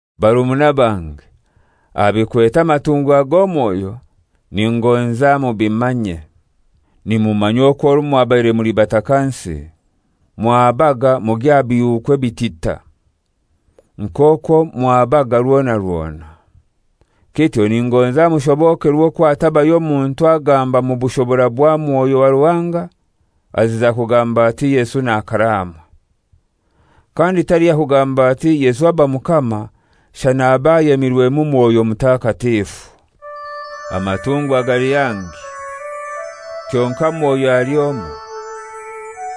Barumuna bange, aha bikwete aha matungwa g'omwoyo ningonza mubimanye. Nimumanya okwo orwo mwabaire muli batakansi mwahabaga mugya aha bihuuku ebitita, nk'okwo mwahabaga rwona rwona. Kityo ningonza mushobokerwe okwo hatabayo muntu agamba mu bushobora bwa Mwoyo wa Ruhanga aziza kugamba ati, «Yesu n'akaraamwe!» Kandi taliho yakugamba ati, «Yesu aba Mukama» shana abe ayemirwemu Mwoyo Mutakatifu. Amatungwa gali hangi, kyonkai Mwoyo ali omoi.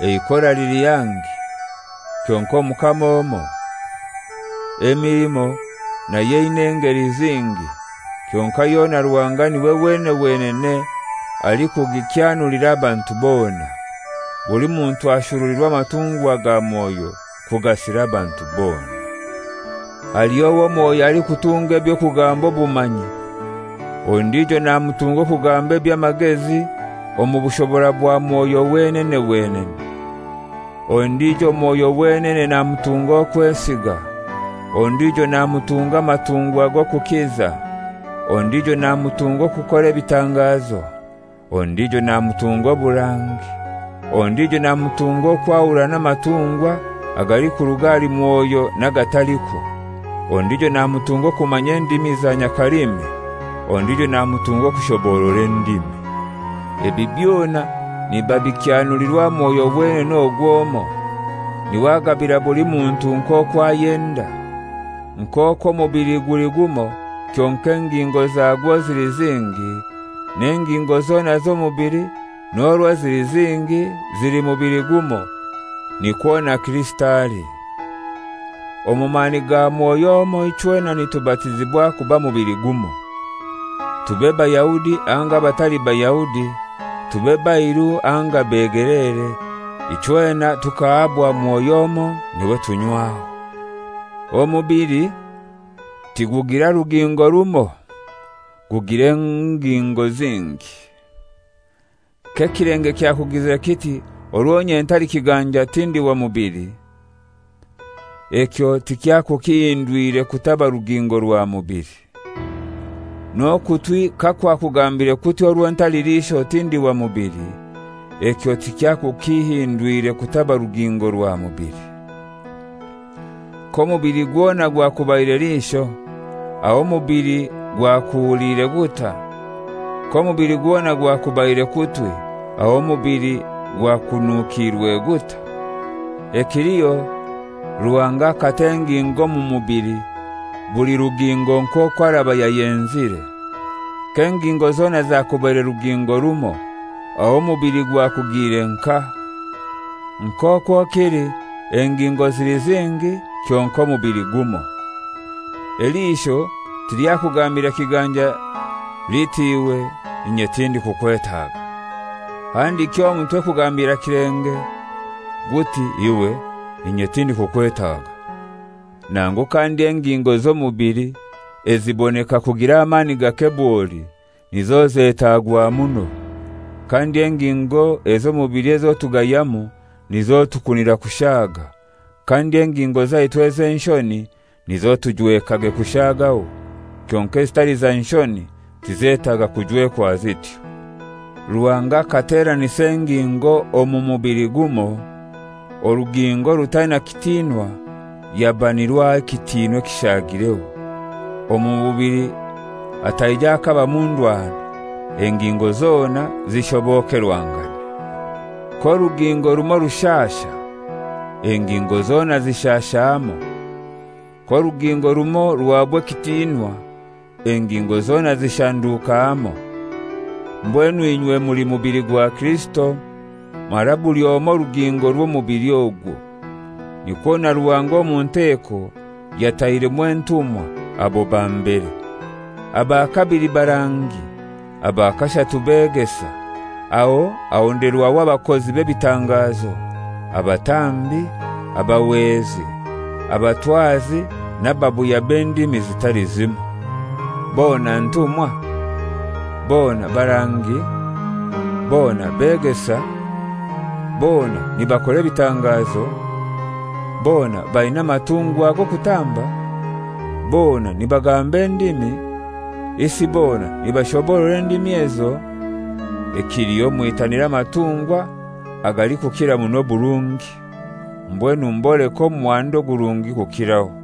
Eikora lili hangi, kyonkai Omukama omoi. Emilimo nayo eina engeli zingi, kyonkai yona Ruhanga n'iwe wenene wenene alikugikyanulira abantu bona. Buli muntu ashurulirwa amatungwa ga Mwoyo kugasira abantu bona. Haliho owo Mwoyo alikutunga eby'okugamba obumanyi; ondijo namutunga okugamba eby'amagezi omu bushobora bwa Mwoyo wenene wenene. Ondijo Mwoyo wenene namutunga okwesiga, ondijo namutunga amatungwa g'okukiza, ondijo namutunga okukora ebitangazo, ondijo namutunga oburangi, ondijo namutunga okwahurana amatungwa agalikuruga ahali Mwoyo n'agatalikwo, ondijo namutunga okumanya endimi za nyakalimi, ondijo namutunga okushoboorora endimi. Ebi byona nibabikyanulirwa Mwoyo wenene ogwo omoi, n'iwe agabira buli muntu nk'okwo ayenda. Nk'okwo omubili guli gumoi kyonkai engingo zagwo zili zingi, n'engingo zona z'omubili, n'orwo zili zingi, zili mubili gumoi, nikwo na Kirisito ali. Omu mani ga Mwoyo omoi ichwena nitubatizibwa kuba mubili gumoi: Tube Bayahudi anga abatali Bayahudi, tube bairu anga begeleere, ichwena tukahabwa Mwoyo omoi n'iwe tunywaho. Omubili tigugira rugingo rumoi, gugira engingo zingi. K'ekilenge kyakugizire kiti, «Orwo inye ntali kiganja tindi wa mubili,» ekyo tikyakukihindwire kutaba rugingo rwa mubili. N'okutwi kakwakugambire kuti, «Orwo ntali liisho tindi wa mubili,» ekyo tikyakukihindwire kutaba rugingo rwa mubili. K'omubili gwona gwakubaire liisho, aho omubili gwakuhuliire gutai? K'omubili gwona gwakubaire kutwi, aho omubili gwakunukiirwe gutai? Ekiliho, Ruhanga akata engingo omu mubili, buli rugingo nk'okwo araba yayenzire. K'engingo zona zakubaire rugingo rumoi, aho omubili gwakugiire nkahai? Nk'okwo kili engingo zili zingi kyonkai omubili gumoi. Eliisho tilyakugambira kiganja liti, «Iwe, inye tindikukwetaga,» handiki omutwe kugambira kilenge guti, «Iwe, inye tindikukwetaga.» Nangu kandi engingo z'omubili eziboneka kugira amani gake bwoli nizo zetaagwa muno, kandi engingo ez'omubili ezo tugayamu nizo tukunira kushaaga, kandi engingo zaitu ez'enshoni nizo tujwekage kushaagaho, kyonkai ezitali za nshoni tizetaaga kujwekwa zityo. Ruhanga akateranisa engingo omu mubili gumoi, orugingo orutaina kitinwa yaba nirwo aha ekitiinwa ekishagireho, omu mubili hataija hakabamu ndwano, engingo zona zishobokerwangane. K'orugingo rumoi rushasha, engingo zona zishasha hamoi. K'orugingo rumoi ruhaabwa ekitiinwa, engingo zona zishanduka hamoi. Mbwenu inywe muli mubili gwa Kirisito, mara buli omoi rugingo rw'omubili ogwo. Nikwo na Ruhanga omu nteko yatairemu entumwa, abo ba mbere; aba kabili barangi, aba kashatu begesa, aho ahonderwaho abakozi b'ebitangazo, abatambi, abahwezi, abatwazi n'ababuya b'endimi zitali zimoi. Bona ntumwa? Bona barangi? Bona begesa? Bona nibakora ebitangazo? Bona baina amatungwa g'okutamba? Bona nibagamba endimi? Isi bona nibashoborora endimi ezo? Ekiliho mwitanire amatungwa agalikukira muno oburungi. Mbwenu mboleke omuhanda ogurungi kukiraho.